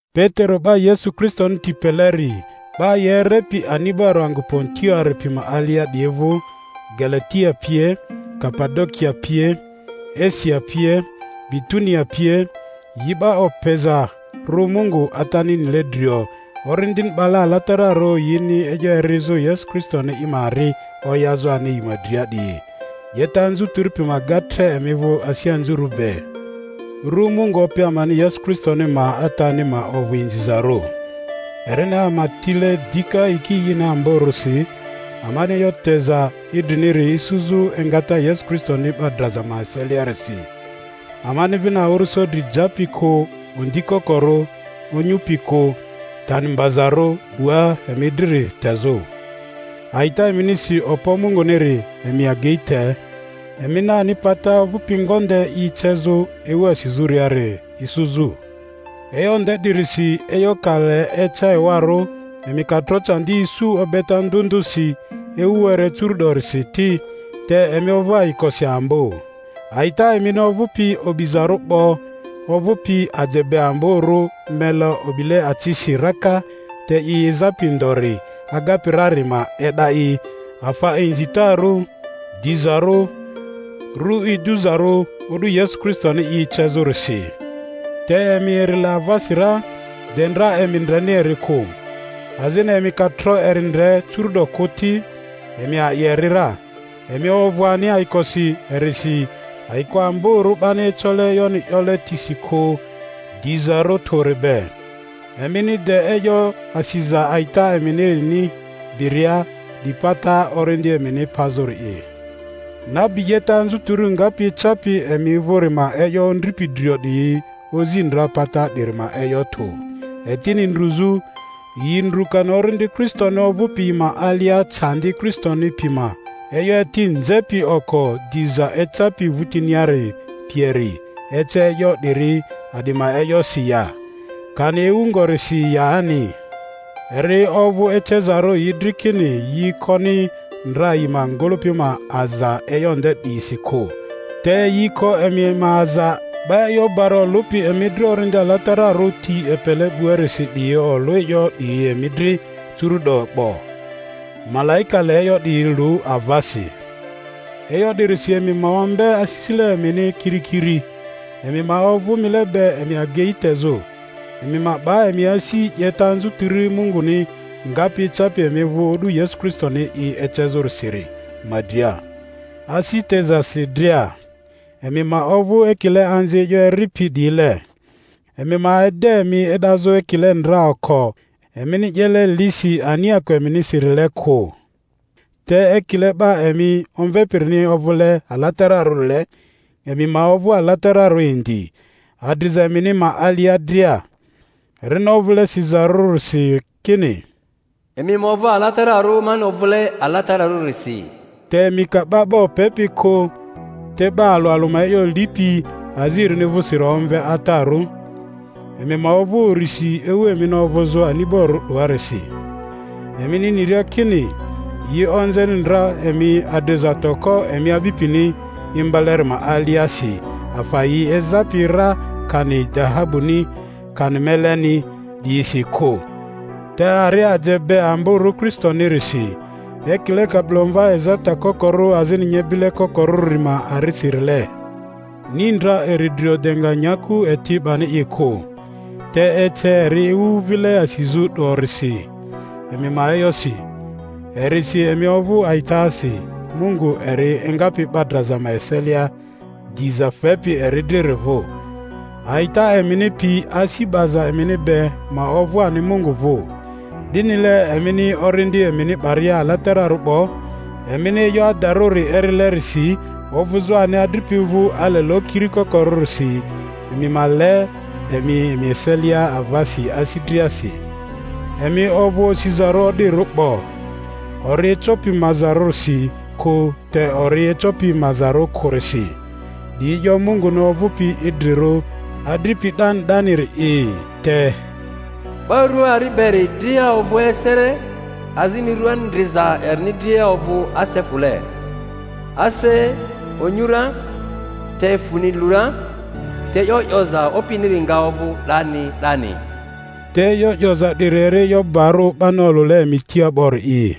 Petero, 'ba Yesu Kristoni ti peleri, 'Ba yi erepi ani'barᴜ angᴜ Pontoari pi ma alia 'diyi vᴜ, Galatia pie, Kapadokia pie, Asia pie, Bitunia pie, yi 'ba opezarᴜ Mungu Atani nile drio, Orindini 'bale alatararᴜ, yini e'yo erizᴜ, Yesu Kristoni i ma ari oyazᴜ ani yi ma dria 'diyi: 'Yeta anzutiri pi ma ga tre emi vᴜ asi anzurᴜ be. Ru Mungu Opi amani Yesu Kristo ma Atani ma ovᴜ inzizarᴜ, erini ama tile dika yiki ini amborᴜsi, amani e'yo teza idriniri isuzᴜ engata Yesu Kristoni 'ba draza ma eseliarisi, amani vini awᴜrᴜso dri japi kᴜ, ondi kokorᴜ, onyupi kᴜ, tani mbazarᴜ 'bua emi driri tezᴜ. A'ita eminisi okpo Munguniri emi agei te, emini ani pata ovᴜpi ngonde i ecezᴜ ewu asizᴜriari isuzᴜ. E'yo nde 'dirisi, e'yo ka le eca ewarᴜ, emi ka tro candi isu obeta ndᴜ ndᴜsi ewu were curu'dorisi ti, te emi ovᴜ ayikosi ambo, a'ita emini ovᴜpi o'bizarᴜ 'bo, ovᴜpi aje be amborᴜ mele o'bile acisi raka te i ezapi ndori agapi rari ma e'da i afa inzitarᴜ, dizarᴜ, ru iduzarᴜ, o'du Yesu Kristoni i ecezᴜrisi. Te emi eri le avasi ra, de ndra emi ndreni eri kᴜ; azini emi ka tro eri ndre curu'do kᴜ ti, emi a'i eri ra, emi ovᴜ ani ayikosi erisi ayiko amborᴜ 'bani ecole e'yoni 'yole tisi kᴜ dizarᴜ tᴜri be, emini de e'yo asiza a'ita eminirini biria, 'di pata orindi emini pazᴜri'i. Nabi 'yeta anzutiri ngapi ecapi emi vᴜri ma e'yo ondripi drio 'diyi ozi ndra pata 'diri ma e'yo tᴜ, etini ndruzᴜ; yi ndrᴜ kani Orindi Kristoni ovᴜpi yi ma alia candi Kristoni pi ma e'yo eti nzepi oko, diza ecapi vᴜtiniari pieri ece e'yo 'diri a'di ma e'yosi ya, kani ewu ngorisi yani. Eri ovᴜ ecezarᴜ yi dri kini yi koni ndra yi ma ngᴜlᴜpi ma aza e'yo nde 'diyisi kᴜ, te yi ko emi ma aza; 'ba e'yo bari olᴜpi emi dri Orindi Alatararᴜ ti epele 'buarisi 'diyi olᴜ e'yo 'diyi emi dri curu'do 'bo; malaika le e'yo 'diyi lu avasi. E'yo 'dirisi emi ma ombe asisile emini kirikiri, emi ma ovᴜ mile be emi agei tezᴜ, emi ma 'ba emi asi 'yeta anzutiri Munguni ngapi ecapi emi vᴜ o'du Yesu Kristoni i ecezᴜrisiri ma dria, asi tezasi dria. Emi ma ovᴜ ekile anzi e'yo eripi 'diyile, emi ma ede emi e'dazᴜ ekile ndra oko emini 'yele lisi aniako eminisirile kᴜ, te ekile 'ba emi omvepirini ovᴜle alatararᴜrile, emi ma ovᴜ alatararᴜ indi adriza emini ma alia dria; erini ovᴜle sizarᴜrisi kini, Emi ma ovᴜ alatararᴜ mani ovᴜle alatararᴜrisi. Te emi ka 'ba 'ba opepi kᴜ te 'ba alᴜ alᴜ ma e'yo lipi azi erini vᴜsiri omve Atarᴜ, emi ma ovᴜ urisi ewu emini ovᴜzᴜ ani'borᴜ 'doarisi, emini niria kini yi onzeni ndra emi adriza toko emi a'bipini imbaleri ma aliasi afa yi ezapi ra kani dahabuni, kani meleni 'diyisi kᴜ, te ari aje be amborᴜ Kristonirisi, ekile kabilomva ezata kokorᴜ azini nyebile kokorᴜri ma arisirile. Ni ndra eri drio, de nga nyaku eti 'bani i kᴜ, te ece eri ewu vile asizᴜ 'dorisi, emi ma e'yosi. Erisi emi ovᴜ a'itasi Mungu eri engapi 'ba draza eselia diza fepi eri driri vᴜ, a'ita emini pi asi 'baza emini be ma ovᴜ ani Mungu vᴜ. 'Dinile emini orindi emini 'baria alatararᴜ 'bo, emini e'yo adarᴜri erilerisi ovᴜzᴜ ani adripi vᴜ ale lokiri kokorᴜrisi, emi ma le emi emi eselia avasi asi driasi. Emi ovᴜ osizarᴜ o'dirᴜ 'bo, ori ecopi mazarᴜrisi kᴜ te ori ecopi mazarᴜ kᴜrisi, 'di e'yo Munguni ovᴜpi idrirᴜ, adripi 'dani 'daniri'i. Te Ba rᴜa ari beri dria ovᴜ asele azini rᴜa ndriza erini dria ovᴜ ase fᴜle. Ase onyu ra, te fᴜni lu ra, te e'yo 'yoza Opiniri nga ovᴜ 'dani 'dani. Te e'yo 'yoza 'diri eri e'yo barᴜ 'bani olᴜle emi tia 'bori'i.